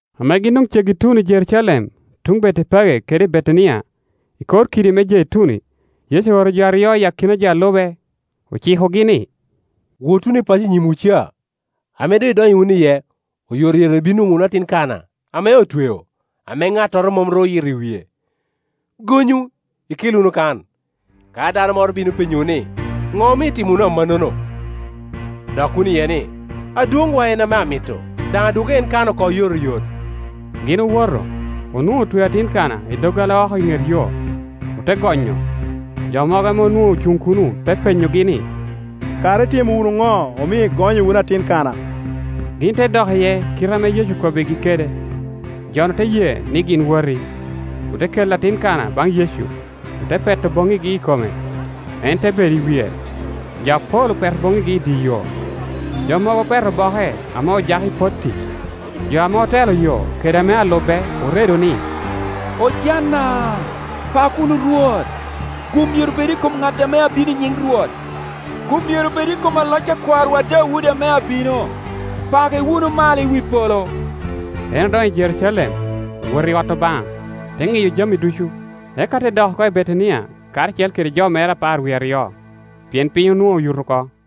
Ame gin doŋ ceggi i tuno i Jerucalem, tuŋ Betepage kede Betania, i kor kidi me Jeituni, Yecu ooro jo aryo i akina jo a lube, ocikogi ni, “Wot wunu i paco i nyimwu ca. Ame doŋ idonyo wunu iye, oyotoyot ibino nwoŋo wunu atin kana, ame otweo, ame ŋattoro mom ru oyito i wie; gonyu, ikel wunu kan. Ka dano moro bino penyowu ni, ‘Ŋo omio itimo wunu amannono?’ dok wunu iye ni, ‘Adwoŋwa en ame amito; daŋ adwoggo en kan oko oyotoyot.’” Gin owoto, onwoŋo otweo atin kana i doggola oko i ŋet yo, ote gonyo. Jo mogo ame onwoŋo ocuŋ kuno te penyogi ni, “Kara itimo wunu ŋo omio igonyo wunu atin kana?” Gin te dok iye i kite ame Yecu okobbigi kede. Jo-nu te ye ni gin woti. Ote kelo atin kana baŋ Yecu, ote peto boŋŋigi i kome, en te bedo i wie. Jo apol opeto boŋŋigi i dye yo, jo mogo opeto boke ame ojako i potti. Jo ame otelo yo kede ame alube oredo ni, “Ojana, pak wunu Rwot! Gum myero bed i kom ŋat ame abino i nyiŋ Rwot! Gum myero bed i kom loc a kwarowa Daudi ame abino! Pake wunu malo i wi polo!” En odonyo i Jerucalem, owoto i ot Obaŋa, te ŋiyo jami ducu, eka te dok oko i Betania karacel kede jo mere apar wie aryo, pien piny onwoŋo oyuto oko.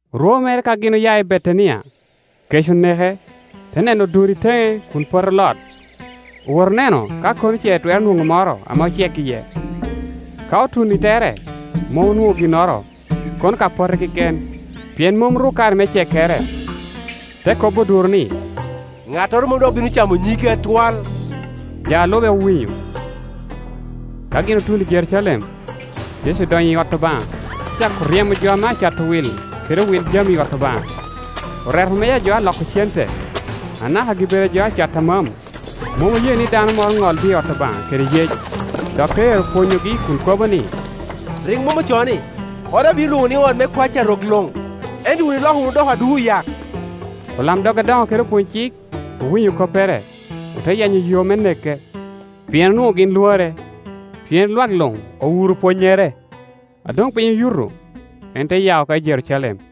Orwo mere ka gin oya i Betania, kec oneke. Te neno oduro i teŋe kun pote olot, owoto oneno ka kono ce etwero nwoŋo moro ame ocek iye. Ka otuno i tere, mom onwoŋo ginnoro, kono ka pote keken, pien mom ru kare me cekkere. Te kobo oduro ni, “Ŋattoro mom dok bino camo nyigi atwal.” Jo a lube owinyo. Ka gin otuno i Jerucalem, Yecu odonyo i ot Obaŋa, te cako ryemo jo ame cato wil kede owil jami i ot Obaŋa. Oreto meja a jo a loko cente, anaka gi-bedo a jo a cato amam; mom oye ni dano moro ŋol dye ot Obaŋa kede yec. Dok te ero pwonyogi kun kobo ni, “Rik mom ocoo ni, ‘Oda obino lwoŋo ni ot me kwac a rok luŋ?’ Ento wun iloko wunu odoko adu oyak.” Olamdog adoŋo kede opwony-cik owinyo koppere, ote yenyo yo me neke; pien onwoŋo gin lwore, pien lwak luŋ owuro pwonnyere. A doŋ piny oyuto, en te ya oko i Jerucalem.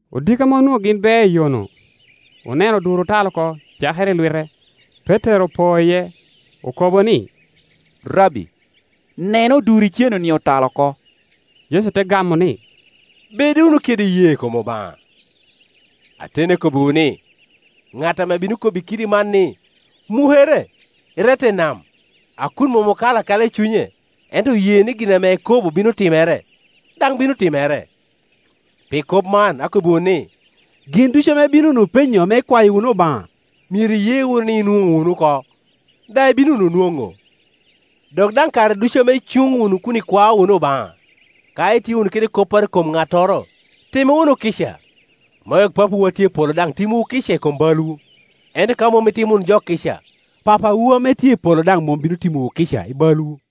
Odiko ame onwoŋo gin beo iyo-nu, oneno oduro otal oko cakere i lwite. Petero opo iye, okobo ni, “Rabbi, neno oduro iceno-ni otal oko.” Yecu te gamo ni, “Bed wunu kede iyee i kom Obaŋa. Kor. 13.2Ateni akobbiwu ni, ŋat ame bino kobbi kidi man ni, ‘Mukere, irette i nam,’ a kun mom okalo akala i cunye, ento oye ni gin ame ekobo bino timere, daŋ bino timere. Pi kop man akobbiwu ni, gin ducu ame ibino wunu penyo ame ikwayo wunu Obaŋa, myero iye wunu ni inwoŋo wunu oko, daŋ ibino wunu nwoŋo. Dok daŋ kare ducu ame icuŋ wunu kun ikwao wunu Obaŋa, ka itye wunu kede kopporo i kom ŋattoro, time wunu kica, me wek Papawu a tye i polo daŋ timwu kica i kom balwu. [ Ento ka mom itimo wunu jo kica, Papawu ame tye i polo daŋ mom bino timowu kica i balwu.]”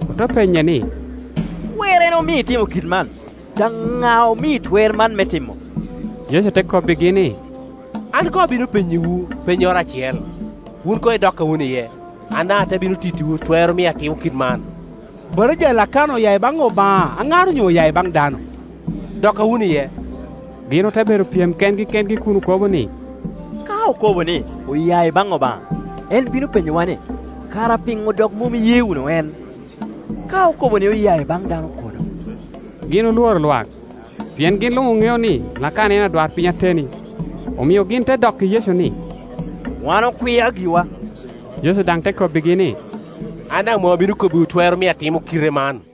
Ote penye ni, “Twerrene omio itimo kit man? Daŋ ŋa omii twer man me timo?” Yecu te kobbigi ni, “An koŋ abino penyowu pennyoro acel; wun koŋ idokka wunu iye, an daŋ ate bino tittiwu twer omio atimo kit man. Batija a Lakana oya i baŋ Obaŋa aŋar onyo oya i baŋ dano? Dokka wunu iye.” Gin ote bedo pyem kengi kengi kun okobo ni, “Ka okobo ni, ‘Oya i baŋ Obaŋa’, en bino penyowa ni, ‘Kara piŋo dok mom iye wunu en?’ Ka okobo ni, ‘Oya i baŋ dano’, kono?” Gin olworo lwak, pien gin luŋ oŋeo ni Lakana en adwarpiny ateni. Omio gin te dokki Yecu ni, “Wan okwia giwa.” Yecu daŋ te kobbigi ni, “An daŋ mom abino kobbiwu twer omio atimo kite man,”